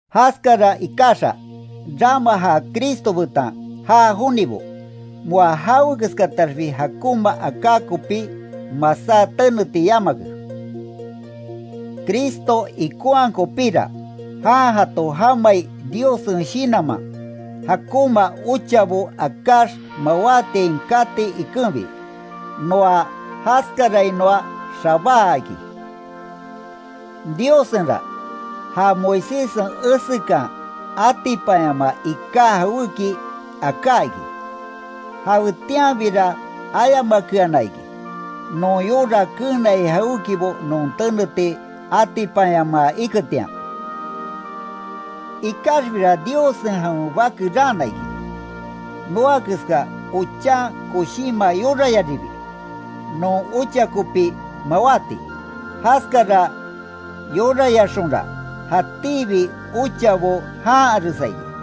Jaskara ikaxa, rama ja Cristo betan já jonibo, moa jawekeskataxbi jakonma aka kopí masá teneti yamake. Cristo ikonhaa kopíra, jan jato jamai Diossen Shinanman, jakonma ochabo akáx mawátiain kati ikenbi, noa jaskarainoa xabáa iki. Diossenra, ja Moiséssen esekan atipanyamaa ika jawéki aká iki. Jawetianbira ayamakeana iki, non yora keenai jawékibo non teneti atipanyamaa iketian. Ikaxbira Diossen jawen bake raana iki, noa keska ochan koshinma yorayaribi, non ocha kopi mawati. Jaskara yorayaxonra, jatíbi ochabo janharesa iki.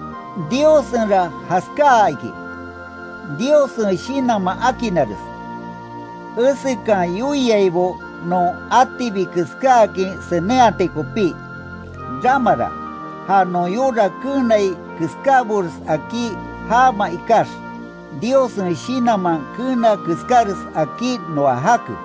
Diossenra jaskáa iki, Diossen Shinanman akinnares, esekan yoiaibo non atibi keskáakin senenhati kopí. Ramara, ja non yora keenai keskábores akí jaama ikax, Diossen Shinanman keena keskáres akí noa jake.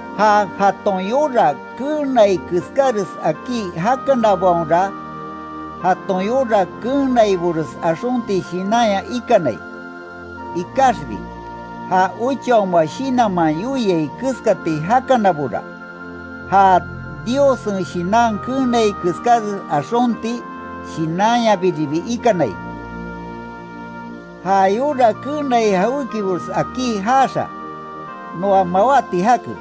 Ja jaton yora keenai keskáres akí jakanabaonra, jaton yora keenaibores axonti shinanya ikanai. Ikaxbi, ja Ochaoma Shinanman yoiai keskati jakanabora, ja Diossen Shinan keenai keskáres axonti shinanyabiribi ikanai. Ja yora keenai jawékibores akí jaaxa, noa mawáti jake.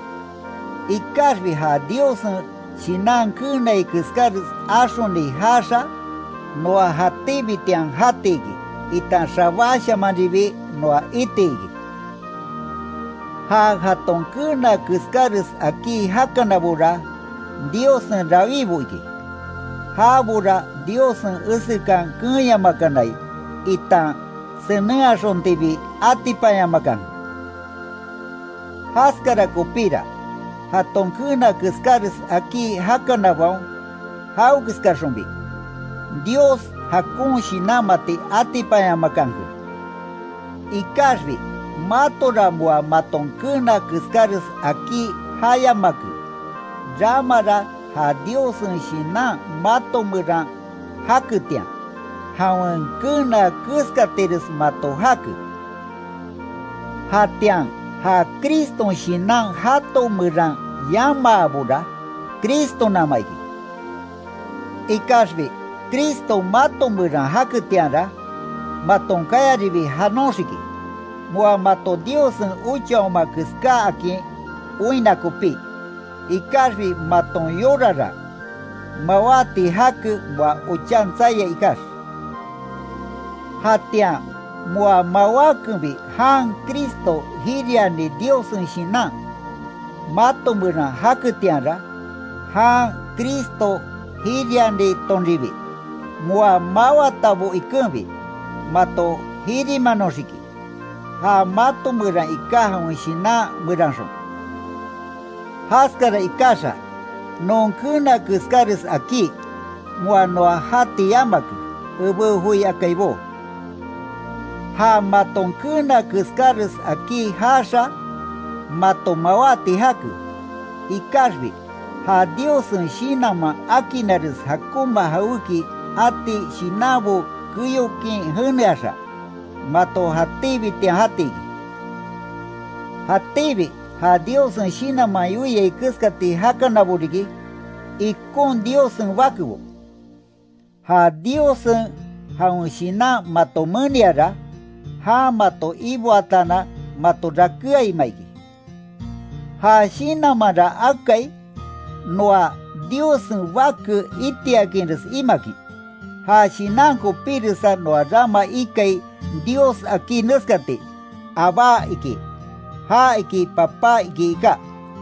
Ikaxbi ja Diossen Shinan keenai keskáres axoni jaaxa, noa jatíbitian jati iki, itan xabáshamanribi noa itiki. Ja jaton keena keskáres akí jakanabora, Diossen rawíbo iki, jabora Diossen esekan keenyamakanai itan senenhaxontibi atipanyamakanke. Jaskara kopíra, jaton keena keskáres akí jakanabaon, jawekeskaxonbi, Dios jakon shinanmati atipanyamakanke. Ikaxbi matora moa maton keena keskáres akí jayamake. Ramara ja Diossen Shinan mato meran jaketian, jawen keena keskatires mato jake. Jatian ja Criston Shinan jato meran yamaabora, Cristonama iki. Ikaxbi Cristo mato meran jaketianra, maton kayaribi janoxiki. Moa mato Diossen ochaoma keskáakin oinna kopí. Ikaxbi maton yorara, mawáti jake moa ochan tsaia ikax. Jatian moa mawákenbi jan Cristo jiriani Diossen Shinan, mato meran jaketianra, jan Cristo jirianitonribi, moa máwatabo ikenbi, mato jirimanoxiki, ja mato meran iká jawen Shinan meranxon. Jaskara ikaxa, non keena keskáres akí, moa noa jati yamake, ebé joi akaibó. Ja maton keena keskáres akí jaaxa, mato mawáti jake. Ikaxbi, ja Diossen Shinanman akinnares jakonma jawéki ati shinanbo keyokin jeneaxa, mato jatíbitian jati iki. Jatíbi ja Diossen Shinanman yoiai keskati jakanabo riki, ikon Diossen bakebo. Ja Diossen jawen Shinan mato meniara, jan mato iboataanan mato rakéaima iki. Ja Shinanmanra akai, noa Diossen bake itiakinres imakin. Ja Shinan kopíresa noa rama ikai Dios akí neskati, ¡Abbá! iki, (ja iki Papá iki iká).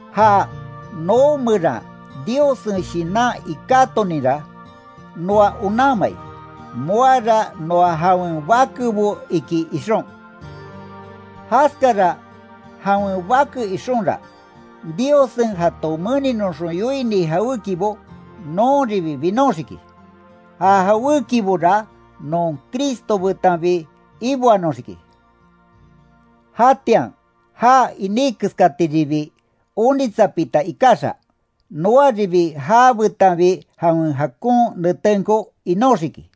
Ja noo meran Diossen Shinan ikátoninra, noa onanmai, moara noa jawen bakebo iki ixon. Jaskara jawen bake ixonra, Diossen jato meninoxon yoini jawékibo, nonribi binoxiki. Ja jawékibora non Cristo betanbi iboanoxiki. Jatian já iní keskatiribi onitsapita ikaxa, noaribi jabetanbi jawen jakon netenko inóxiki.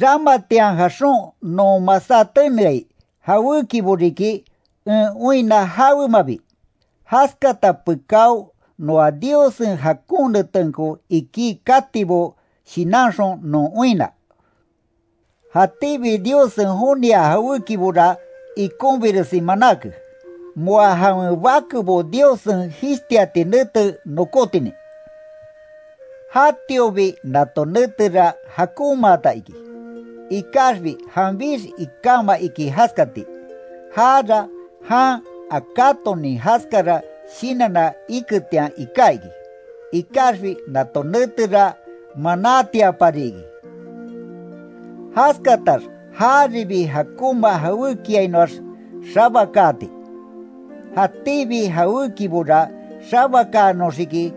Ramatian jaxon non masá teneai jawékibo riki en oinna jawemabi, jaskata pekáo noa Diossen jakon netenko iki katibo shinanxon non oinna. Jatíbi Diossen joniaa jawékibora ikonbiresi manáke, moa jawen bakebo Diossen jishtiati nete nokótinin. Jatiobi nato netera jakonmaata iki, ikaxbi janbix ikáma iki jaskati, jara jan akátonin jaskara shinanna iketian iká iki. Ikaxbi nato netera manátiapari iki, jaskatax jaribi jakonma jawékiainoax xabakaati. Jatíbi jawékibora xabakaanoxiki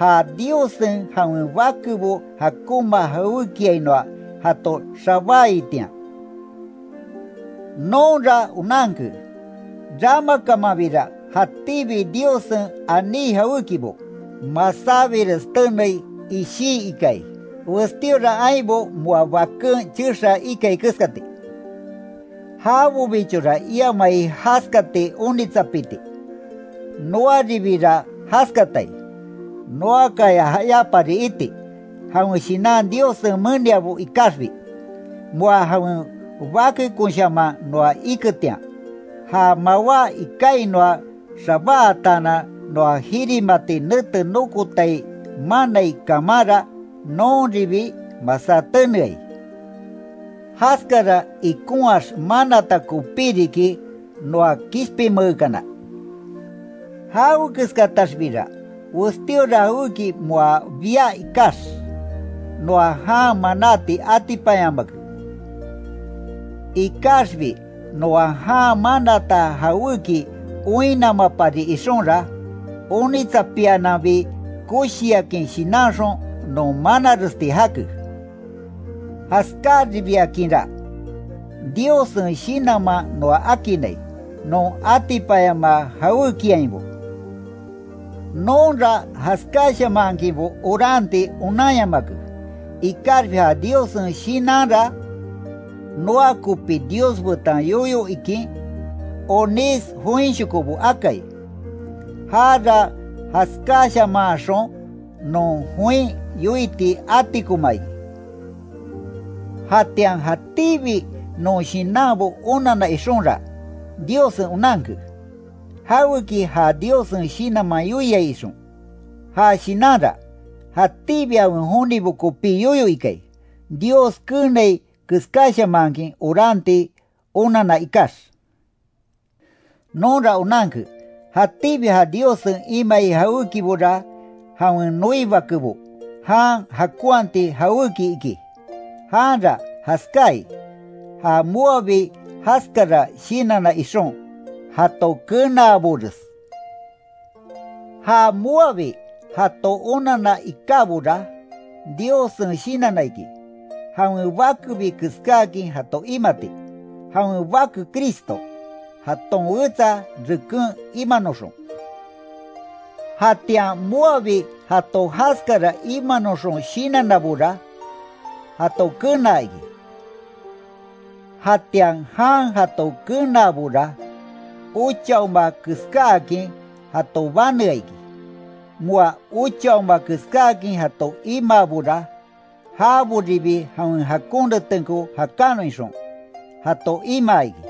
ja Diossen jawen bakebo jakonma jawékiainoa jato xabáaitian. Nonra onanke, ramakamanbira jatíbi Diossen aní jawékibo, masábires tenei ishí ikai, westíora ainbo moa baken chexaa ikai keskati. Jabobichora iamai jaskati onitsapiti, noaribira jaskatai. Noakaya jayapari iti, jawen Shinan Diossen meniabo ikaxbi. Moa jawen bakekonshaman noa iketian, ja mawá ikainoa xabáatanan noa jirimati nete nokotai manai kamanra nonribi masá teneai. Jaskara ikonhaax manata kopí riki noa kishpinmeekana. Jawekeskataxbira, westíora jawéki moa bia ikax, noa jan manáti atipanyamake. Ikaxbi noa jan manata jawéki oinnamapari ixonra, onitsapiananbi koshiakin shinanxon non manaresti jake. Jaskaribiakinra, Diossen Shinanman noa akinnai, non atipanyamaa jawékiainbo. Nonra jaskáshamanhakinbo oranti onanyamake, ikaxbi ja Diossen Shinanra, noa kopi Dios betan yoyo ikin, onís joinshoko akai. Jara jaskáshamanhaxon non join yoiti atikoma iki. Jatian jatíbi non shinanbo onanna ixonra, Diossen onanke, jaweki ja Diossen Shinanman yoiai ixon. Ja Shinanra, jatíbi jawen jonibo kopí yoyo ikai, Dios keenai keskáshamankin oranti onanna ikax. Nonra onanke, jatíbi ja Diossen imai jawékibora jawen noi bakebo, jan jakonhati jawéki iki, janra jaskáai, ja moabi jaskara shinanna ixon, jato kenaabores. Ja moabi jato onanna ikábora, Diossen shinanna iki, jawen bakebi keskáakin jato imati, jawen Bake Cristo, jaton wetsa reken imanoxon. Jatian moabi jato jaskara imanoxon shinannabora, jato kenaa iki, jatian jan jato kenaabora, ochaoma keskáakin jato banea iki, moa ochaoma keskáakin jato imaabora, jaboribi jawen jakon netenko jakanon ixon, jato imaa iki.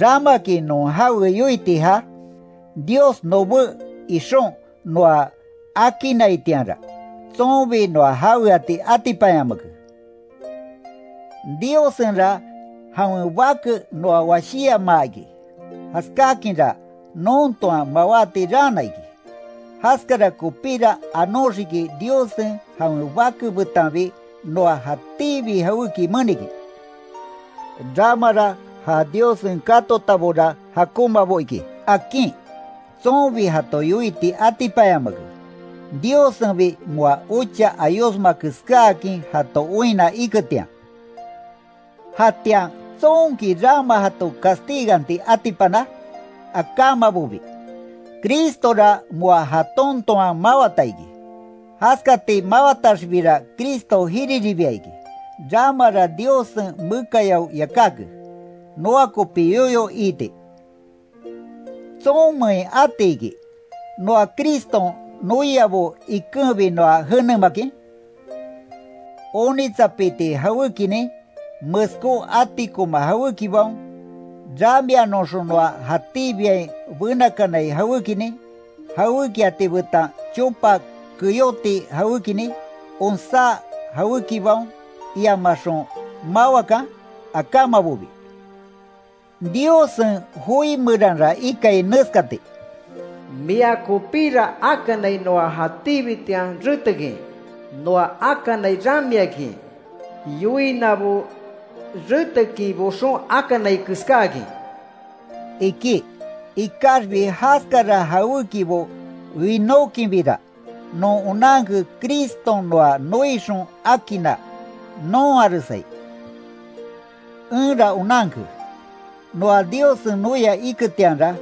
¿Ramaki non jawe yoiti ja? Dios nobé ixon noa akinnaitianra, tsonbi noa jaweati atipanyamake. Diossenra jawen bake noa washíyamaa iki, jaskakinra non toan mawáti raana iki. Jaskara kopíra anóxiki Diossen jawen Bake betanbi noa jatíbi jawéki menikin. Ramara ja Diossen katotabora jakonmabo iki, akin, tsonbi jato yoiti atipanyamake, Diossenbi moa ocha ayosma keskáakin jato oinna iketian. ¿Jatian tsonki rama jato castiganti atipana? Akamabobi, Cristora moa jaton toan mawata iki. Jaskati mawataxbira Cristo jiriribia iki, ramara Diossen mekayao yakáke, noa kopi yoyo iiti. ¿Tsonmein atiki, noa Criston noiabo, ikenbi noa jenemakin? ¿Onitsapiti jawékinin, meskó atikoma jawékibaon, ramianoxon noa jatíbiain benakanai jawékinin, jawékiati betan chopa keyoti jawékinin, onsá jawékibaon, iamaxon mawakan? Akamabobi. Diossen joi meranra ikai neskati: “Mia kopira akanai noa jatíbitian retekin, noa akanai ramiakin, yoinabo retekin boxon akanai keskáakin”, iki. Ikaxbi jaskara jawékibo winókinbira, non onanke Criston noa noixon akinna, nonharesai. Enra onanke, noa Diossen noia iketianra,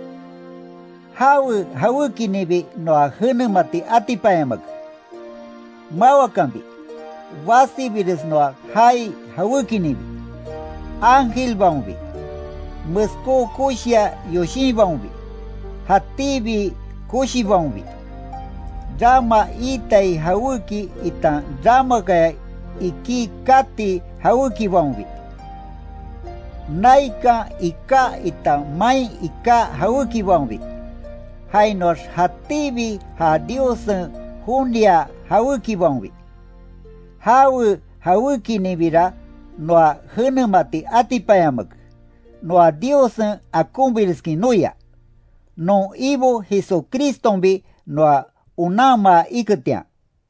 jawe jawékininbi noa jenemati atipanyamake. Mawakanbi, basibires noa jaai jawékininbi, ángelbaonbi, meskó koshiya yoshinbaonbi, jatíbi koshibaonbi, rama itai jawéki itan ramakaya iki kati jawékibaonbi, naikan iká itan main iká jawékibaonbi, jainoax jatíbi ja Diossen joniaa jawékibaonbi. ¡Jawe jawékininbira noa jenemati atipanyamake, noa Diossen akonbireskin noia, non Ibo Jesucristonbi noa onanmaa iketian!